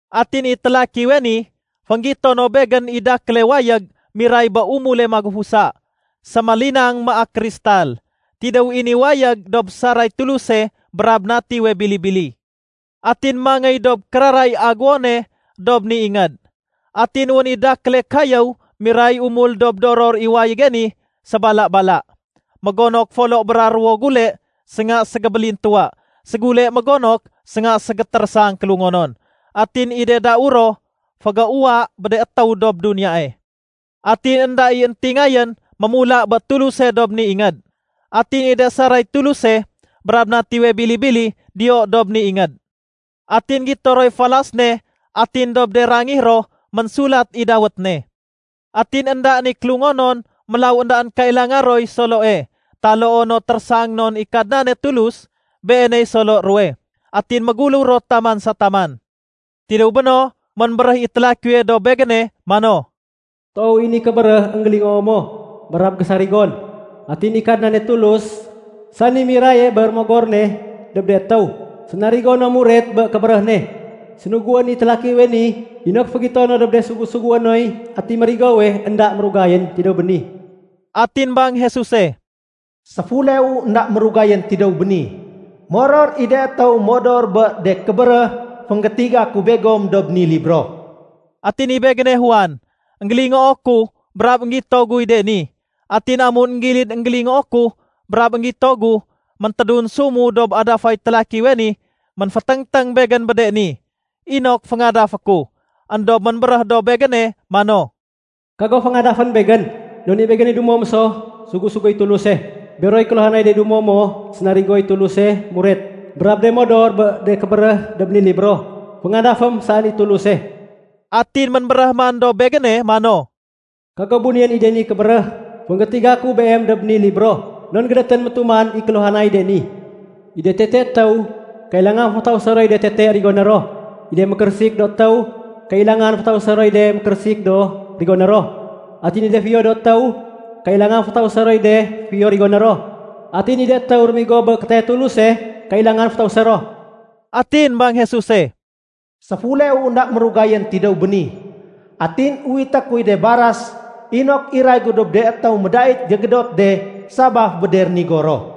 Atin i télakiwe ni, fénggito no begén i dakéle wayég miray bé umule magufusa. Sémélinang maak kristal. Tidéw i ni wayég dob saray Tuluse brab Natiwe Bili-bili. Atin mangéy dob kérara i aguwone dob ni ingéd. Atin wén i dakéle kayéw miray umul dob doror i wayége ni sébala-bala. Mégonok folo bra ruwo gule sénga ségébélintuwa. Ségule mégonok sénga ségétérésang kélungonon. Atin i de dau ro fégéuwa bé de étéw dob duniyae. Atin énda i éntingayén mémula bé Tuluse dob ni ingéd. Atin i de saray Tuluse brab Natiwe Bili-bili diyo dob ni ingéd. Atin gito roy falas ne atin dob de rangih ro ménsulat i dawét ne. Atin éndaén i kélungonon, mélaw éndaén kailanga roy soloe taloo no térésang non i Kadnane Tulus, Beeney solo ruwe. Atin méguléw ro taman sa taman. Tidéw béno, ménbéréh i télakiwe dob begéne mano, “Toow i ni kébéréh énggélingoo mo brab gésarigon. Atin i Kadnane Tulus, sani miraye bé Rémogor ne dob de étéw sénarigo no muret bé kébéréh ne, sénuguén i télakiwe ni inok fégito no dob de sugu-sugué noy atiy mérigowe énda mérugayén tidéw béni.” Atin bang Jesuse, “Séfuleu énda mérugayén tidéw béni! Moror i de étéw modor bé de kébéréh fénggétiga ku begom dob ni libro.” Atin i begéne Juan. Enggélingoo ku brab énggito guy de ni. Atin amun énggilid énggélingoo ku brab énggito gu, méntédunsumu dob adafay télakiwe ni ménféténgténg begén bé de ni, inok féngadafé ku. Endob ménbéréh dob begéne mano, “Kago féngadafén begén. Non i begéne dumo mo so sugu-suguéy Tuluse, beroy kéluhanay de dumo mo sénarigoy Tuluse muret, brab de modor bé de kébéréh dob ni libro. Féngadafém saén i Tuluse.” Atin ménbéréh man dob begéne mano, “Kago bunéyén i de ni kébéréh fénggétiga ku beem dob ni libro. Non gédétén métuman i kéluhanay de ni. I de tete étéw, kailangan fétausé roy de tete rigoné ro. I de mékérésik do étéw, kailangan fétausé roy de mékérésik do rigoné ro. Atin i de fiyo do étéw, kailangan fétausé roy de fiyo rigoné ro. Atin i de étéw rémigo bé kétayay Tuluse, kailangan fétausé ro.” Atin bang Jesuse, “Séfuleu énda mérugayén tidéw béni! Atin uwité kuy de baras inok iray gu dob de étéw médait gégédot de sabaf bé de rénigo ro.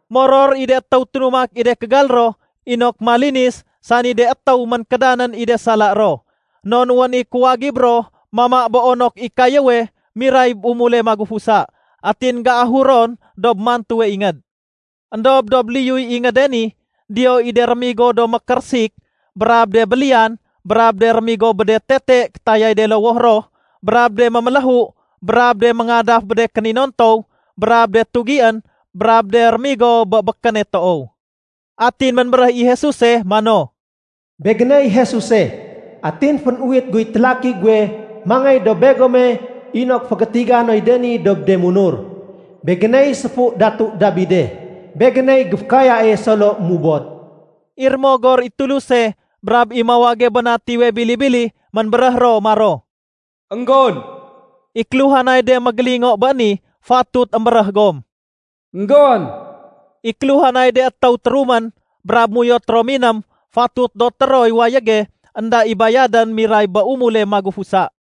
Moror i de étéw ténumak i de kégal ro inok malinis, sani de étéw ménkédanén i de sala ro, non wén i kuwagib ro mama bé onok i kayéwe miray bé umule magufusa, atin géahur ron dob mantuwe ingéd. Endob dob liyuy ingéde ni, diyo i de rémigo do mékérésik brab de béliyan brab de rémigo bé de tete kétayay de lowoh ro, brab de méméléhu, brab de méngadaf bé de kéninontow, brab de tugién, brab de rémigo bé békéne toow. Atin ménbéréh i Jesuse mano, “Begéney Jesuse, atin fénuwit guy télaki guwe mangéy dob begome inok fégétiga noy de ni dob de munur. Begéney séfu datu Dabide. Begéney géfékayae solo mubod.” I Rémogor i Tuluse brab i mawage bé Natiwe Bili-bili, ménbéréh ro maro, “Enggon!” I kéluhanay de mégélingo bé ni, fatut émbéréh gom “Enggon!” I kéluhanay de étéw térumén, brab méuyot ro miném, fatut doté roy wayége énda i bayadén miray bé umule magufusa.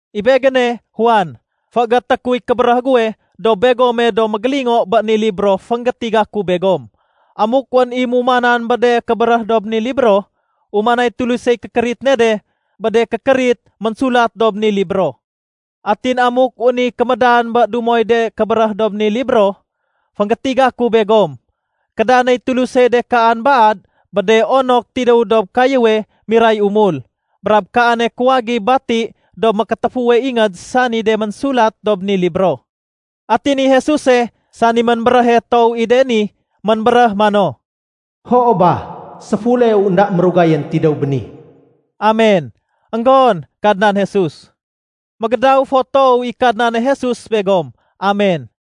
I begéne, Juan, féégété kuy kébéréh guwe dob begome do mégélingo bé ni libro fénggétiga ku begom. Amuk wén i mumanan bé de kébéréh dob ni libro, umanay Tulusey kékérit ne de bé de kékérit ménsulat dob ni libro. Atin amuk wén i kémédan bé dumoy de kébéréh dob ni libro fénggétiga ku begom, kédanéy Tulusey de kaan baad bé de onok tidéw dob kayéwe miray umul, brab kaane kuwagib bati dob mékétéfuwe ingéd sani de ménsulat dob ni libro. Atin i Jesuse, sani ménbéréhe toow i de ni, ménbéréh mano, “Hoo ba, séfuleu énda mérugayén tidéw béni.” Amen. Enggon, Kadnan Jesus! Mégédaw fo toow i Kadnane Jesus begom. Amen.